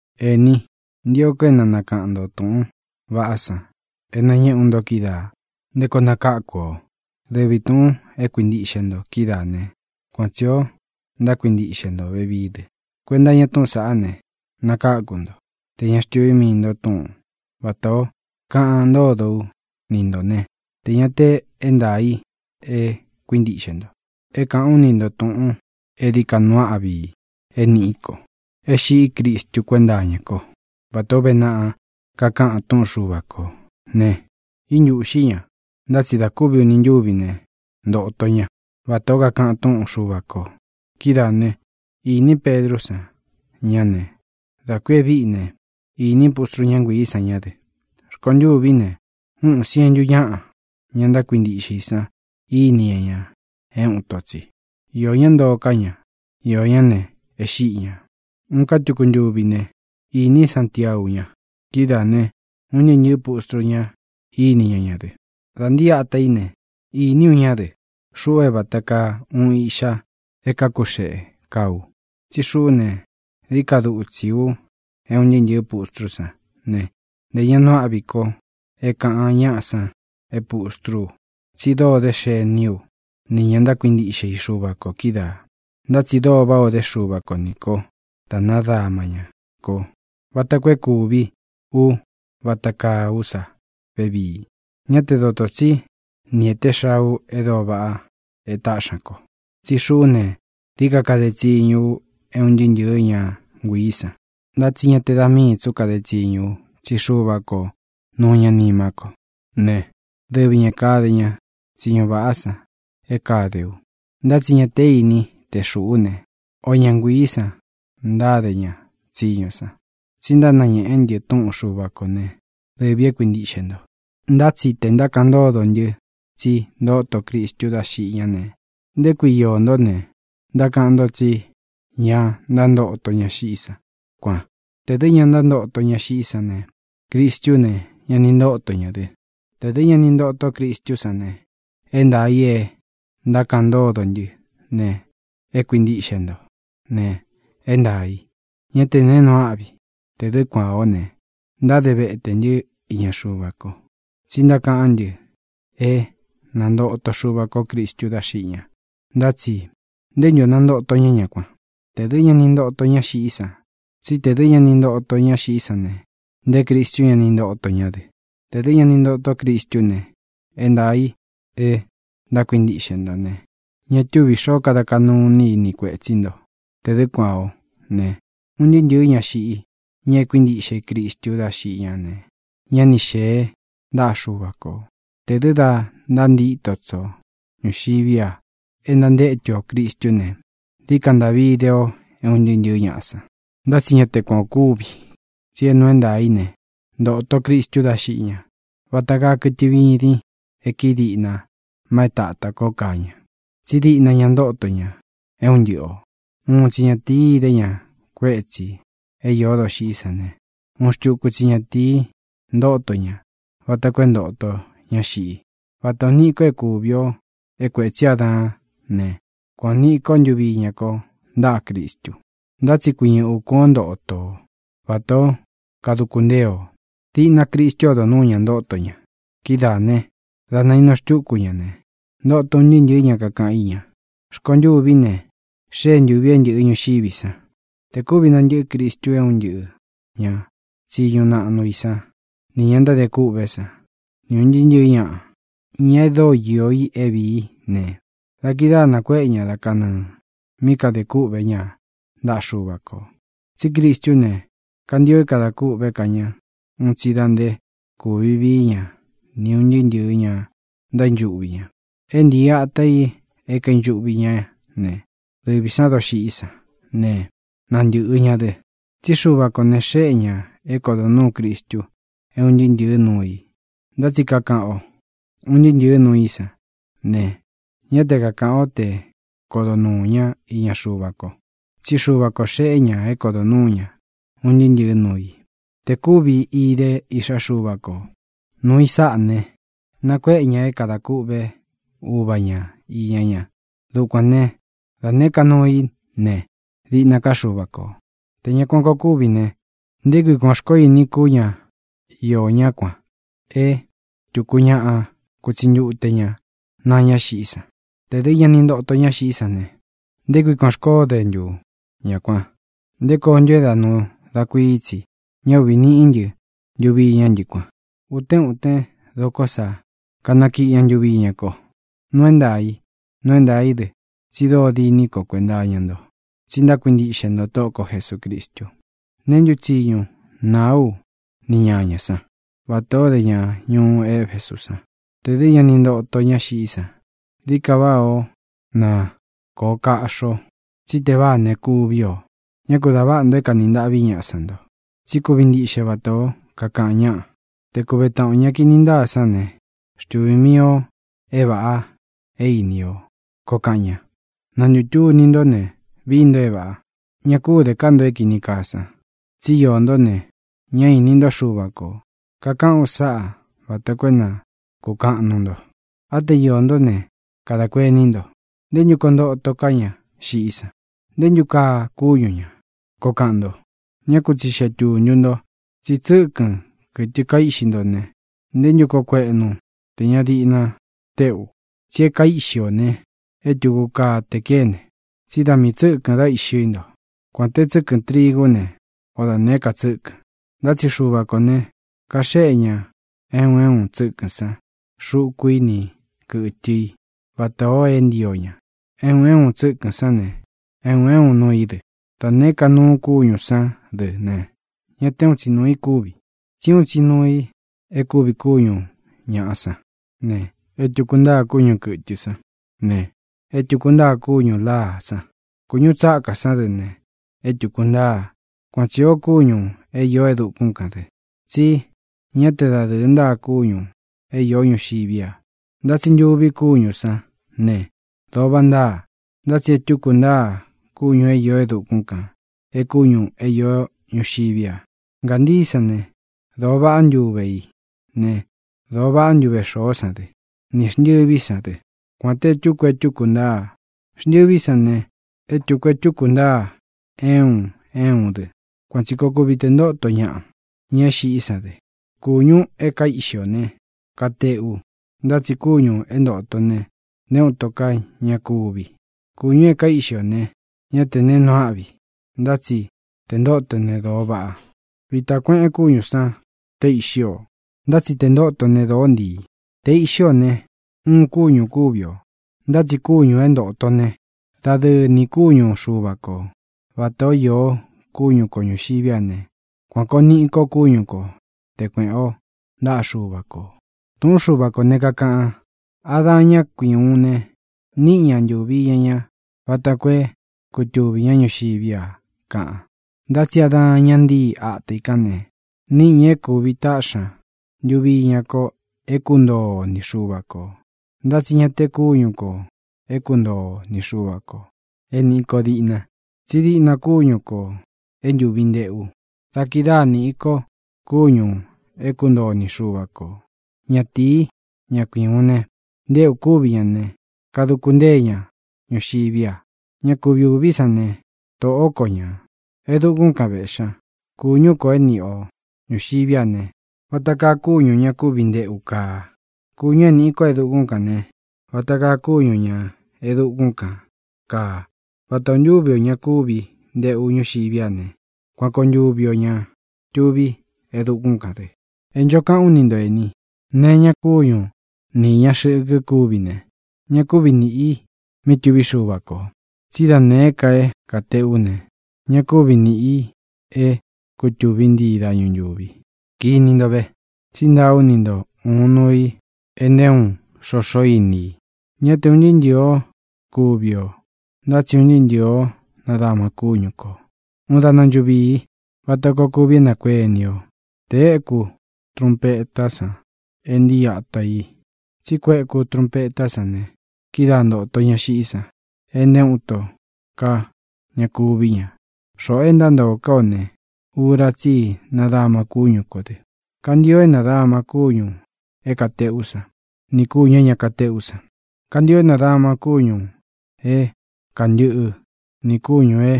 Ení, ntio ko é na nakaꞌan ntō túꞌūn vaꞌá san é nañéꞌe ú nto kídaā nté koo nakáku ō. Dɨvi tūꞌun é kuintíꞌxe nto kídaa ne, kuan tsī ó ntákuintiꞌxe nto vevií dɨ. Kuenta iña túꞌūn saꞌá ne, nakáku nto, tē ña xtuvi mii nto túꞌun vatā o kaꞌan ntódo ú ni ntō ne, tē ña te é ntaā i é kuintíꞌxe nto. É kāꞌán u ni nto tūꞌun é dií ka nuu áꞌvi i é nīꞌí ko: é xiꞌí Cristu kuénta iña kó, vatā ó uve naꞌa kakaꞌan túꞌun Xuva kō ne, íntūꞌxí ña, ntá tsi da kúvi uni ntúvi ne, ntōto ñá vatā ó kakaꞌan túꞌun Xuva kō. Kídaā ne, iní Pedrú san ña ne, dā ku e víꞌi ne, īní pustrú ña nguiī san ñá dɨ. Rkontûví ne, úꞌun siēntu ñáꞌa, ña ntákuintiꞌxe i san, íni ña ña é uun ito tsi. Iō ñá ntoo ká ña; iō ñá ne, e xíꞌi ñā. Uun ká tuku ntuví ne, īní Santiau ña; kidáā ne, un ntɨɨ́ ntɨ̄ɨ́ pustru ña íni ña ña dɨ. Dā ntíi ata í ne, iní u ñá dɨ, xuꞌu é vata kaa uun iꞌxa é kākú xeꞌe kaa u. Tsí xuꞌú ne, dií ka dutsi u é un ntɨɨ́ ntɨ̄ɨ́ pustrú san ne, ntē ña nuu âꞌví ko é kāꞌan ñaꞌa san é pustrú u, tsí dóo dé xení u ni ñā ntákuintiꞌxe i Xuva kō kídaā. Ntá tsi dóo váꞌā o dé Xuva ko nī ko dá nadama ñá ko vata koo é kūví u vata kaa ú sa vevii. Ñá te dotō tsí ni ēté xaa u e dóo vaꞌa e táꞌxi ña ko, tsí xuꞌú ne, dií ka kade tsiñu u é un ntɨɨ́ ntɨ̄ɨ́ ña nguiī san. Ntá tsi ña te da míī tsú kade tsiñu u, tsí Xuva ko nuu ña nimá ko ne, dɨvi ñā kade ña tsiñu vaꞌá san é kāde u. Ntá tsi ña té ini te xūꞌú ne, o ña nguiī san ntáde ña tsiñu san, tsi ntánañēꞌé ntɨ túꞌun Xuva kō né, dɨvī e kuíntiꞌxe nto. Ntá tsi tē ntákaꞌan ntódo ntɨ tsi ntóto Cristu dá xiꞌi ñá ne, ¿nté kui iō ntó ne, ntákaꞌan nto tsí ña ntántoto ñá xiꞌí san, kuan? Tē dɨ́ ña ntántoto ñá xiꞌí san ne, Cristú ne, ña ni ntóto ña dɨ. Tē dɨ́ ña ni ntotó Cristú san ne, é ntaā í e ntákaꞌan ntódo ntɨ́ ne, e kuíntiꞌxe nto ne, é ntaā í; ñá tē neé nuu áꞌvi. Tē dɨ́ kuān ó ne, ntáde vetē ntɨ́ iña Xuva ko, tsí ntákaꞌán ntɨ é nantoto Xuva kó Cristu dá xiꞌi ña. Ntá tsi ¿nté ntu ō nántoto ña ñá kuan, tē dɨ́ ña ni ntoto ñá xiꞌí san? Tsí tē dɨ́ ña ni ntoto ñá xiꞌí san ne, nté Cristú ña ni ntoto ñá dɨ. Tē dɨ́ ña ni ntotó Cristú ne, é ntaā i é ntákuintíꞌxe nto ne, ña túvī xoó kada kaꞌnu iní i ni kuētsí nto. Tē dɨ́ kuān ó ne, un ntɨɨ́ ntɨ̄ɨ́ ña xiꞌí, ña é kuíntiꞌxe i Cristu dá xiꞌí ne, ñá ni xēe ntáꞌa Xuva kō. Tē dɨ́ da ntántito tsi o ñuxiví a e ntantétu ō Cristú ne, dií ka ntaꞌvi ide ō é un ntɨɨ́ ntɨ̄ɨ́ ñaꞌa san. Ntá tsi ñá te kuān ó kuvi, tsí é nuu é ntaā í ne, ntoto Cristu dá xiꞌi ña. Vata kaa kɨtɨ vidin e kíi diꞌna ma é tatā kó kaa ña, tsí diꞌna ña ntóto ña é un ntɨꞌɨ ō. Uun tsi ñatīí idé ña kuétsī é īó doxiꞌí san ne, uun xtuku tsi ñatīi ntóto ña vata koo é ntōto ña xiꞌi. Vata ō niꞌi ko é kuvi o é kuētsí Adaán ne, kuan ō niꞌi kó ntuvi iña kó ntaꞌa Cristu. Ntá tsi kuiñɨ ukūn ó ntoto o, vatā ó kaduku ntée o. Diꞌna Cristú odo núu ña ntóto ña. Kídaā ne, dá naīnu xtúku ña ne, ntoto un ntɨɨ́ ntɨ̄ɨ́ ña kakaꞌan í ña. Rkontûví ne, xée ntūvi é ntɨ̄ꞌɨ ñuxiví san. Tē kúvi nantɨꞌɨ́ Cristu é un ntɨꞌɨ̄ ña tsiñu naꞌnu i sán, nī ña ntádē kûꞌvé san, ni ūn ntɨɨ́ ntɨ̄ɨ́ ñaꞌa, ña e dóo iō i é vīí ne, da kidáā nakuéꞌe ña da kanɨɨ̄ mí kāde kúꞌvē ñá ntaꞌa Xuva kō. Tsí Cristú ne, kantio é kadā kûꞌvé ka ña un tsi da nté kūvi vií ña ni ūn ntɨɨ́ ntɨ̄ɨ ña ntaínchuꞌvi ña. É ntīi ata i é kaīnchuꞌvi ñá ne, dɨvī sán doxiꞌí san ne, nantɨ̄ꞌɨ ña dɨ. Tsí Xuva kō ne, xéꞌe ñā é kodo nūú Cristu é un ntɨɨ́ ntɨ̄ɨ́ nuu i. Ntá tsi é kākaꞌan o “un ntɨɨ́ ntɨ̄ɨ́ nuu í san” ne, ñá te kakāꞌan o te kodó nuu ña iña Xuva ko, tsí Xuva kō xeꞌé ña é kodo nuū ñá un ntɨɨ́ ntɨ̄ɨ́ nuu i. Tē kúvi idé Iꞌxá Xuva ko nūu i sáꞌa ne, nakuéꞌe ña é kadā kûꞌvé Uva ña īña ña. Dukuān né, da nēé ka nuu í ne, diꞌna ká Xuva kō. Tē ña kuan koo kúvi ne, ¿nté kui kuān xkoó ini kú ña iō ñá kuān é tuku ñaꞌa kutsi ntute ña naa ñá xiꞌí san? Tē dɨ́ ña ni ntoto ñá xiꞌí san ne, ¿nté kui kuān xkoó de ntu ña kuan? ¿Nté koo ntu é da nuu da kuií tsi ña uꞌvi niꞌi ntɨ ntuvi iña ntɨ́ kuan? Uten uten doko sá kanakíꞌi ña ntuvi iñá ko. Nuu é ntaā i. Nuu é ntaā í dɨ tsi dóo diní ko kuenta iña nto, tsi ntákuintiꞌxe nto Tóꞌo ko Jesūcristu. ¿Neé ntu tsiñu nāá u ni ñāñá san, vatā ó de ña ñuú Efesú san ne, tē dɨ́ ña ni ntoto ñá xiꞌí san? Dií ka váꞌā ó na kōꞌo kaꞌxi o, tsí teváā ne, kuví ō. Ñá ku dā váꞌa nto é kanī ntaꞌví ñaꞌa san nto. Tsí kuvi ntiꞌxe vatā ó kakaꞌan ñaꞌa: “Te kuve taꞌan ō ña kini ntáa sán ne, xtuvī mii o é vāꞌa é ini o”, koo kaꞌan ña. Na ntūtuni ntó ne, vií nto é vāꞌa. Ña kú de ká nto é kīni kaa san. Tsi íō ntó ne, ñá īni ntó Xuva kō. Kakaꞌán u sáꞌa vata koo é na kūkaꞌan nuu nto. Á te iō ntó ne, kadā kuení nto: “¿Nté ntu koo ntoto ká ña xiꞌí san? ¿Nté ntu kaa kúñu ñā?”, koo kaꞌan nto. Ñá ku tsixeꞌe tūntu nto. Tsí tsɨ́kɨn, kɨtɨ kaíꞌxi nto ne, ¿ntē ntú koo kueꞌnu tē ña diꞌna téꞌu? Tsi é kaíꞌxi ō ne, é tūku kaa te kéne. Tsí da miī tsɨ́kɨ̄n dá iꞌxi nto, kuān té tsɨkɨn trigú ne, o da nēé ka tsɨ́kɨ̄n. Ntá tsi Xuva kō ne, kaxéꞌe ña é un é un tsɨ́kɨ̄n sán xuku i ni kɨtɨ i vatā o é ntio ña. É un é un tsɨ́kɨ̄n sán ne, é un é un nuu i dɨ. Da nēé ka nuu kúñū sán dɨ ne, ñá te úun tsi nuū i kúvi. Tsí uun tsi nuu i e kúvi kúñu ñāꞌa sán ne, é tūku ntáa kúñu kɨ̄tɨ san ne, é tūku ntáa kúñū láa sán. Kūñú tsákā sán dɨ ne, é tūku ntáa. Kuan tsī o kúñū é īó e dukún kān dɨ, tsí ña te dadɨ́ɨ ntáa kúñū é īó ñuxiví a. Ntá tsi ntuvi kúñū sán ne, dōo váꞌa ntáa. Ntá tsi e túku ntáa kúñū é īó e dukún kān é kúñū é īó ñuxiví a. Ngāntií san ne, dōo vaꞌá ntuve i ne, dōo vaꞌá ntuve xoó san dɨ, ni xntɨ̄ví san dɨ, kuān te e túku e túku ntáa. Xntɨví san ne, e túku e túku ntáa é un é un dɨ. Kuan tsī koo kuvi te ntóto ñaꞌa, ña é xiꞌí san dɨ. Kūñu e kaíꞌxi ō ne, kateꞌu, ntá tsi kúñū é ntōto ne, nté uun ito ká ña kuvi. Kūñu e kaíꞌxi ō ne, ñá tē neé nuu áꞌvi, ntá tsi tē ntóto ne, dōo vaꞌa. Vitā kueꞌen kúñū sán te iꞌxí ō, ntá tsi tē ntóto ne, dōó ntiī. Te iꞌxí ō ne, uun kúñū kúvi o, ntá tsi kūñu é ntoto ne, dadɨɨ nī kúñu Xuva kō. Vatā ó īo kúñu kō ñuxiví a ne, kuan kōo niꞌi ko kúñu ko te kuēꞌen o ntáꞌa Xuva kō. Tūꞌún Xuva kō ne, kakaꞌan: “Adaan, ñá kui ūún ne, níꞌi ña ntūvi iña ña vata koo é kutuvī ñá ñuxiví a”, kaꞌan. Ntá tsi Adaan, ña ntíi ata i kán ne, níꞌi ña é kūvi taꞌxi ña ntuvi iña ko é kuntoo o ni Xuva kō. Ntá tsi ña te kúñu kō é kuntoo o ni Xuva kō é nīꞌi ko diꞌna, tsí diꞌna kúñu kō é ntuvi nteꞌu. Da kidáa nīꞌi ko kuñu é kuntoo o ni Xuva kō. Ñatīí, ña kui ūun ne, ntéꞌū kúvi ña ne, kaduku ntée ña ñuxiví a. Ña kuvi ūví san ne, Tóꞌo ko ñā. E dúkūn kan véꞌxi ña. Kūñú kō é niꞌi o ñūxiví a ne, vata kaa kúñū ña kúvi nteꞌu kaa. Kūñu é nīꞌi ko e dukún kān ne, vata kaa kúñū ña e dukún kān kaa. Vata ō ntúvi ō ña kúvi nteꞌu ñuxiví a ne, kuan koo ntuvi ō ña tuví e dukún kān dɨ. E ncho kaꞌán u ni nto, ēni: Nee é īña kúñu ni īña xɨkɨ kúvi ne, ña kúvi nīꞌi mí tuví Xuva kō. Tsí da nēé ka é kāteꞌú ne, ña kúvi nīꞌi é kutūví ntii dañu ntūvi. Kini nto ve tsí ntaa ú ni nto ūun nuu i é nté uun xoxo íni i: Ñá te ūn ntɨɨ́ ntɨ̄ɨ ó kuvi ō, ntá tsi un ntɨɨ́ ntɨ̄ɨ ó nadáma kúñu kō. Uun daꞌna nchuvii, vata koo kuvi é nakuéni o, te éku trunpeta san é ntii ata i. Tsí kueku trunpetá san ne, kidáa ntōto ñá xiꞌí san e nté uun ito ka ña kuví ña. Xoꞌō é ntántoo ká ō ne, ura tsí i nadama kúñu kō dɨ. Kantio é nādama kúñū é kāteꞌú san nī kúñū é ña katéꞌú san. Kantio é nādama kúñū é kantɨꞌɨ nī kúñū é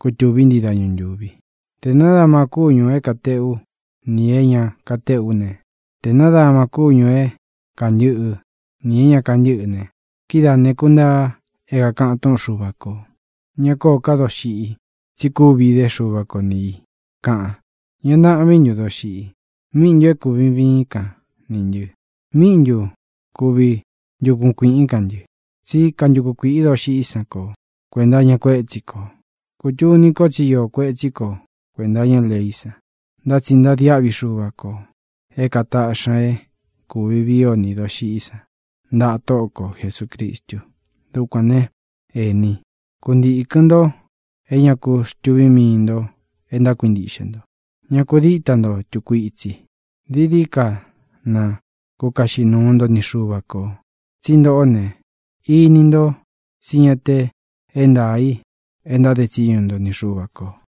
kutūví ntii dañu ntūvi. Tē nádama kúñū é kateꞌú nī é ña katéꞌú ne, te nādama kúñū é kantɨꞌɨ nī é ña kantɨ́ꞌɨ ne, kidáā ne, kuntaa é kākaꞌan túꞌun Xuva kō: “Ña kóō ká doxiꞌi, tsi kúvi idé Xuva ko ni ī”, kaꞌan. ¿Ña ntaꞌvín ntun, doxiꞌi? ¿Míꞌi ntu é kūvi viín kan nī ntɨ? ¿Míꞌi ntu kuvi ntuku kuīꞌín kan ntɨ? Tsí kantuku kuīꞌi doxiꞌí san ko kuēnta iña kuétsi kō ne, kūtuni ko tsi íō kuetsí ko kuēnta iña leí san. Ntá tsi ntadiáꞌvi Xuva kō é kātaꞌxi ña é kūvi vii o ni dóxiꞌí san ntaꞌa Tóꞌo ko Jesūcristu. Dukuān né, ēní, kuntīkɨn nto é ña ku xtuví mii ntō e ntákuintiꞌxe nto; ña ku díta nto tūku itsi. Dií dií ka na kukaꞌxi nuu nto ni Xuva kō, tsí ntoꞌó ne, ini ntó tsi ña te é ntaā í e ntáde tsiñu nto ni Xuva kō.